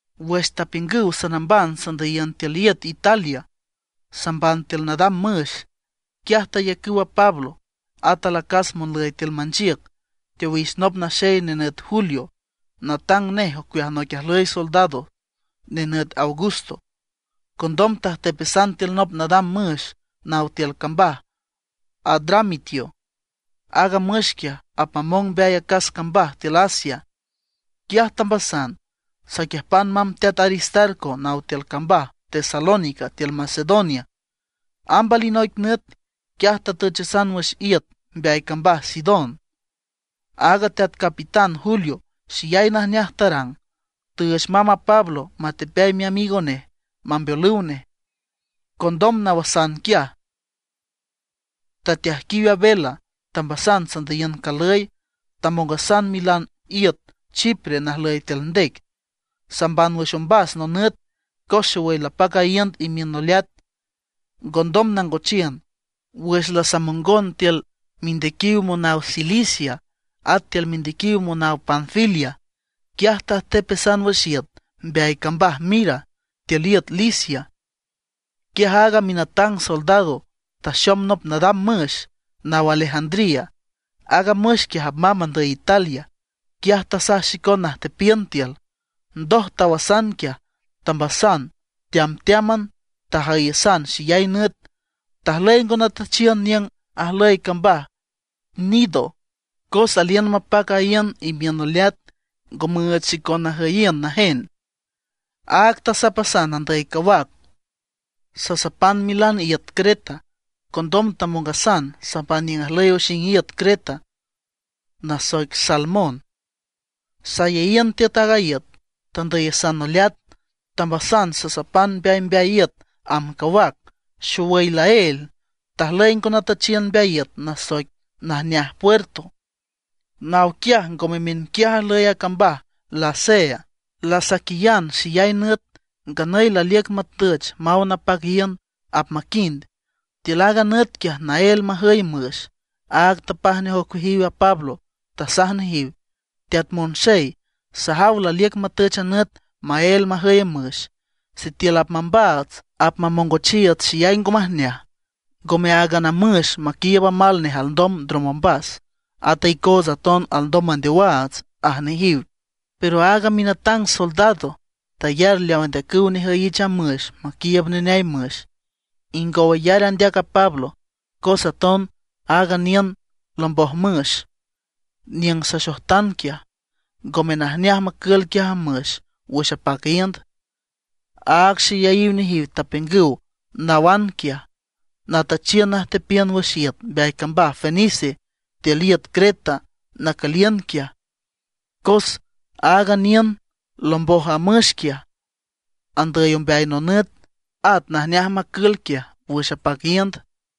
Wüx tapiüngüw sanamban sandüyiün tiül iüt Italia, samban tiül nadam müx, quiaj tayacüw a Pablo, at alacas monlüy tiül manchiüc, teowix nop naxey nenüt Julio, natang nej ocueaj noic ajlüy soldados nenüt Augusto. Condom tajtepasan tiül nop nadam müx naw tiül cambaj Adramitio. Aaga müx quiaj apmamong mbeay acas cambaj tiül Asia. Quiaj tambasan, saquiüjpan mamb teat Aristarco naw tiül cambaj Tesalónica tiül Macedonia. Amb alinoic nüt, quiaj tatüchasan wüx iüt mbeay cambaj Sidón. Aaga teat capitán Julio xeyay najneaj tarang, tüüch mamb a Pablo matepeay miamigo nej, mambeolüw nej. Condom nawasan quiaj, tateajquiw a vela, tambasan sandüyiün calüy, tamongasan milan iüt Chipre najlüy tiül ndec, samban wüx ombas nonüt, cos xowüy lapac a iünd imiün noleat, ngondom nangochiün. Wüx lasamongon tiül mindequiw monaw Cilicia, at tiül mindequiw monaw Panfilia, quiaj tajtepasan wüx iüt mbeay cambaj Mira tiül iüt Licia. Quiaj aaga minatang soldado taxom nop nadam müx naw Alejandría. Aaga müx quiaj apmamb andüy Italia. Quiaj tasaj xicon najtepiün tiül. Ndoj tawasan quiaj, tambasan teamteáman, tajüyasan xeyay nüt. Tajlüy ngo natüchiün niüng ajlüy cambaj Gnido, cos aliün mapac a iünd imiün noleat, ngo müüch xicon najüyiün najen. Áag tasapasan andüy cawac, sasapan milan iüt Creta. Condom tamongason samban niüng ajlüy oxing iüt Creta nasoic Salmón. Sayeyiün tiüt aaga iüt, tandüyasan noleat. Tambasan sasapan mbeaymbeay iüt amb cawac. Xowüy laél, tajlüy ngo natüchiün mbeay iüt nasoic Najneaj Puerto. Naw quiaj ngome miünquiaj ajlüy a cambaj Lasea. Lasaquiyan xeyay nüt, nganüy laliüc matüch maw napac iünd, apmaquind. Tiül aaga nüt quiaj naél majüy müx, áag tapaj nej ocueajiw a Pablo. Tasaj nejiw: ―Teat monxey, sajaw laliüc matüch a nüt maél majüy müx. Sitiül apmambaats, apmamongochiiüts xeyay ngo majneaj. Ngome áagan a müx maquiiüb amal nej alndom ndrom ombas, at a icootsa aton alndom mandeowaats ―aj nejiw. Pero aaga minatang soldado tayar leaw andeacüw nejüyich a müx maquiiüb neneay müx, ingow ayar andeac a Pablo. Cos aton aaga niüng lomboj müx, niüng saxojtan quiaj, ngome najneaj macül quiaj a müx wüx apac iünd, áag xeyayiw nejiw tapiüngüw nawan quiaj, natüchiün najtepiün wüx iüt mbeay cambaj Fenice tiül iüt Creta nacüliün quiaj. Cos aaga niüng lomboj a müx quiaj andüy ombeay nonüt, at najneaj macül quiaj wüx apac iünd.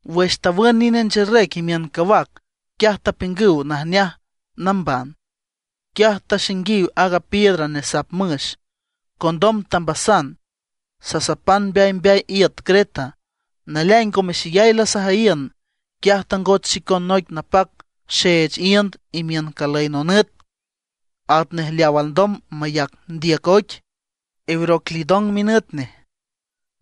Wüx tawün nine ncherec imiün cawac, quiaj tapiüngüw najneaj namban. Quiaj taxainguiw aaga piedra nesap müx. Condom tambasan, sasapan mbeaymbeay iüt Creta. Naleaing ngome xeyay lasajüyiün, quiaj tangoch xicon noic napac xeech iünd imiün calüy nonüt, atnej leaw alndom mayac ndiüc oic, Euroclidón minüt nej.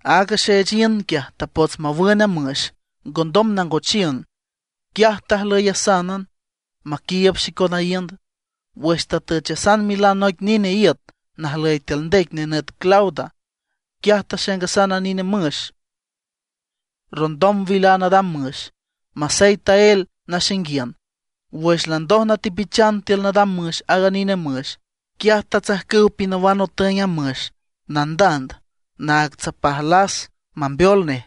Aaga xeech iünd quiaj, tapots mawün a müx, ngondom nangochiün. Quiaj tajlüyasánan maquiiüb xicon a iünd. Wüx tatüchasan milan noic nine iüt najlüy tiül ndec nenüt Clauda, quiaj taxaingasan a nine müx rondon wil a nadam müx, masey taél naxainguiün. Wüx landoj natepichan tiül nadam müx aaga nine müx, quiaj tatsajcüw pinawan otüeng a müx nandand naag tsapaj las mambeol nej.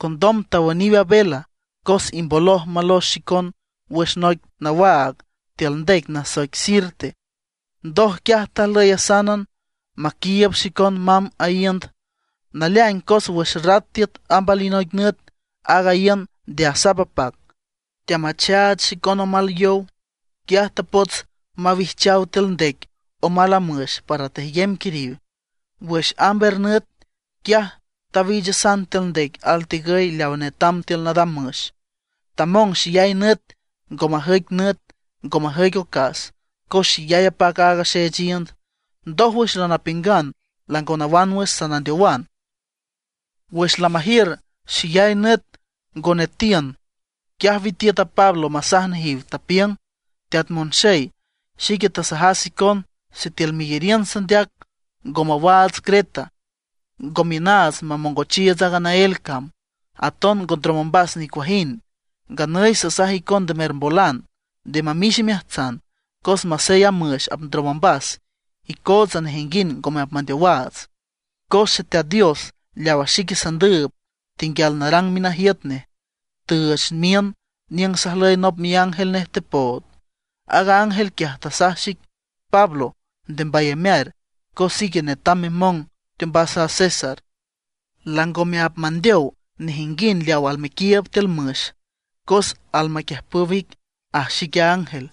Condom tawüniw a vela cos imboloj malox xicon wüx noic nawaag tiül ndec nasoic Sirte. Ndoj quiaj tajlüyasánan maquiiüb xicon mamb a iünd. Naleaing cos wüx rat tiüt amb alinoic nüt aaga iünd nde asap apac, teamachach xicon omal yow. Quiaj tapots mawijchaw tiül ndec amal a müx para tejyem quiriw. Wüx amb er nüt, quiaj tawiichasan tiül ndec altigüy leawa netam tiül nadam müx. Tamong xeyay nüt ngo majüic nüt, ngo majüic ocas, cos xeyay apac aaga xeech iünd. Ndójwüx lanapiüngan lango nawan wüx, sanandeowan. Wüx lamajiür xeyay nüt ngo netiün, quiaj witiüt a Pablo masaj nejiw, tapiüng: ―Teat monxey, xique tasajas icon sitiül meyariün sandeac ngo mawaats Creta, ngo miünaats mamongochiiüts aaga naél cam, aton ngo ndrom ombas nicuajind. Nganüy sasaj icon nde mermbolan, nde mamix imeajtsan, cos masey a müx apndrom ombas, icootsa nejinguind ngome apmandeowaats. Cos Xeteat Dios leawa xique sandüüb, tenguial narang minajiüt nej, tüüch miün niüng sajlüy nop miángel nej tepood. Aaga ángel quiaj, tasaj xic: “Pablo, nde mbayamear, cos ique netam memong teombas a César. Langome apmandeow nejinguind leaw almequiiüb tiül müx; cos almaquiüjpüw ic”, aj xic a ángel.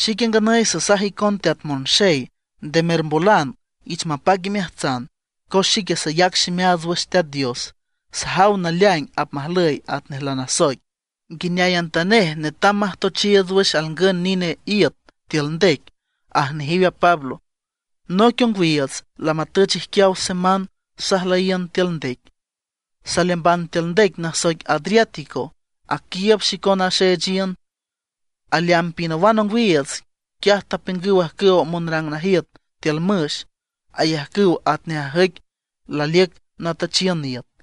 Xique nganüy sasaj icon teat monxey, nde mermbolan, ich mapac imeajtsan, cos xique sayac ximeaats wüx Teat Dios, sajaw naleaing apmajlüy atnej lanasoic. Nguineayantanej netam majtochiiüts wüx alngün nine iüt tiül ndec ―aj nejiw a Pablo. Noic ongwiiüts lamatüch ijquiaw semán sajlüyiün tiül ndec, saleamban tiül ndec nasoic Adriático, aquiiüb xicon a xeech iünd. Aleamb pinawan ongwiiüts, quiaj tapiüngüw ajcüwa monrang najiüt tiül müx ayajcüw atnej ajüic laliüc natüchiün iüt.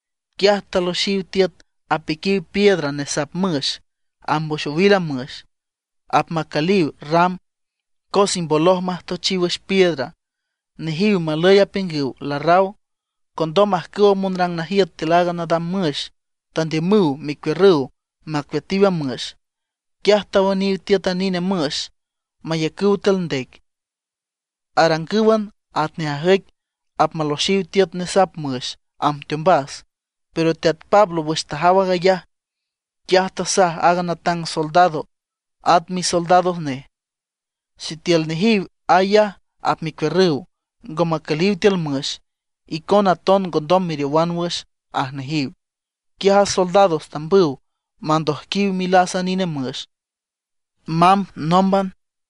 Quiaj taloxiw tiüt apiquiw piedra nesap müx amb wüx owil a müx, apmacüliw ram, cos imboloj majtochiw wüx piedra. Nejiw malüy apiüngüw larraw. Condom ajcüwa monrang najiüt tiül a nadam müx tandiümüw mecuiürrüw macueatiw a müx. Quiaj tawüniw tiüt a nine müx mayacüw tiül ndec, arangǘwan atnej ajüic apmaloxiw tiüt nesap müx amb teombas. Pero teat Pablo wüx tajaw aag ayaj, quiaj tasaj a natang soldado, at misoldados nej: ―Sitiül nejiw ayaj apmecuiürrüw, ngo macüliw tiül müx, icona aton ngondom meriowan wüx ―aj nejiw. Quiaj a soldados tambüw mandojquiw milas a nine müx, mamb nómban.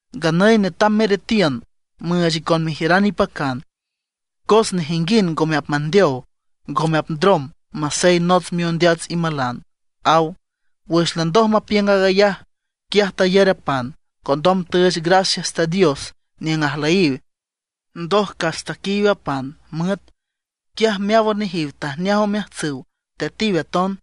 Nganüy netam meretiün, müüch icon mejiüran ipacan. Cos nejinguind ngome apmandeow, ngome apndrom masey nots miondeats imalan ―aw. Wüx landoj mapiüng aag ayaj, quiaj tayar a pan. Condom tüüch gracias Teat Dios niüng ajlüyiw. Ndoj cas taquiiw a pan müet. Quiaj meáwan nejiw tajneaj omeajtsüw, tetiw aton.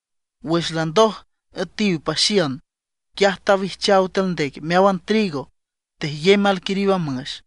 Wüx landoj üetiw paxiün, quiaj tawijchaw tiül ndec meáwan trigo, tejyem alquiriw a müx.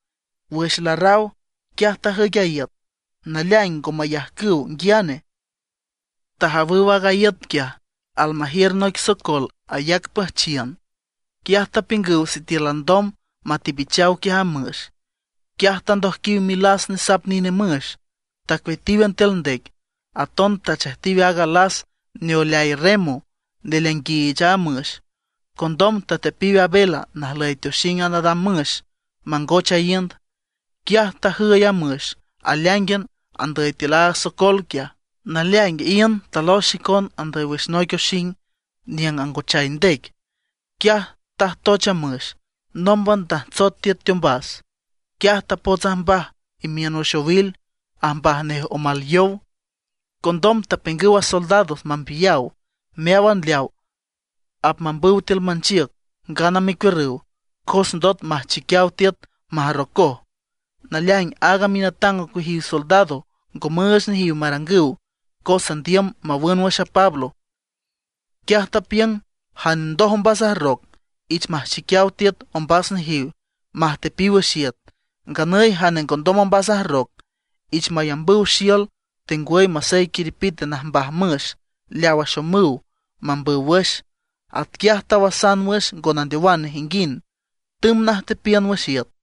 Wüx larraw, quiaj tajüic a iüt, naleaing ngo mayajcüw nguiane. Tajawüw aaga iüt quiaj almajiür noic socol ayac püjchiün. Quiaj tapiüngüw sitiül alndom matepichaw quiaj a müx. Quiaj tandojquiw milas nesap nine müx, tacueatíwan tiül ndec. Aton tachejtiw aaga las neoeleay remo neleainguiich a müx. Condom tateapiw a vela najlüy teoxing a nadam müx mangoch a iünd. Quiaj tajüy a müx aleáingan andüy tiül aaga socol quiaj. Naleaing iünd talox xicon andüy wüx noic oxing niüng angochay ndec. Quiaj tajtoch a müx, nómban tajtsot tiüt teombas. Quiaj tapots ajmbaj imiün wüx owil, ajmbaj nej omal yow. Condom tapiüngüw a soldados mambiyaw meáwan leaw apmambüw tiül manchiüc ngana mecuiürrüw, cos ndot apmajchiquiaw tiüt majrrocoj. Naleaing aaga minatang ocueajiw soldados ngo müüch nejiw marangüw cos andiüm mawün wüx a Pablo. Quiaj tapiüng jane ndoj ombas ajrroc, ich majchiquiaw tiüt ombas nejiw, majtepiw wüx iüt. Nganüy jane ngondom ombas ajrroc, ich mayambüw xiül tengwüy masey quiriw najmbaj müx leaw axomüw mambüw wüx. Atquiaj tawasan wüx ngo mandeow nejinguind, tümb najtepiün wüx iüt.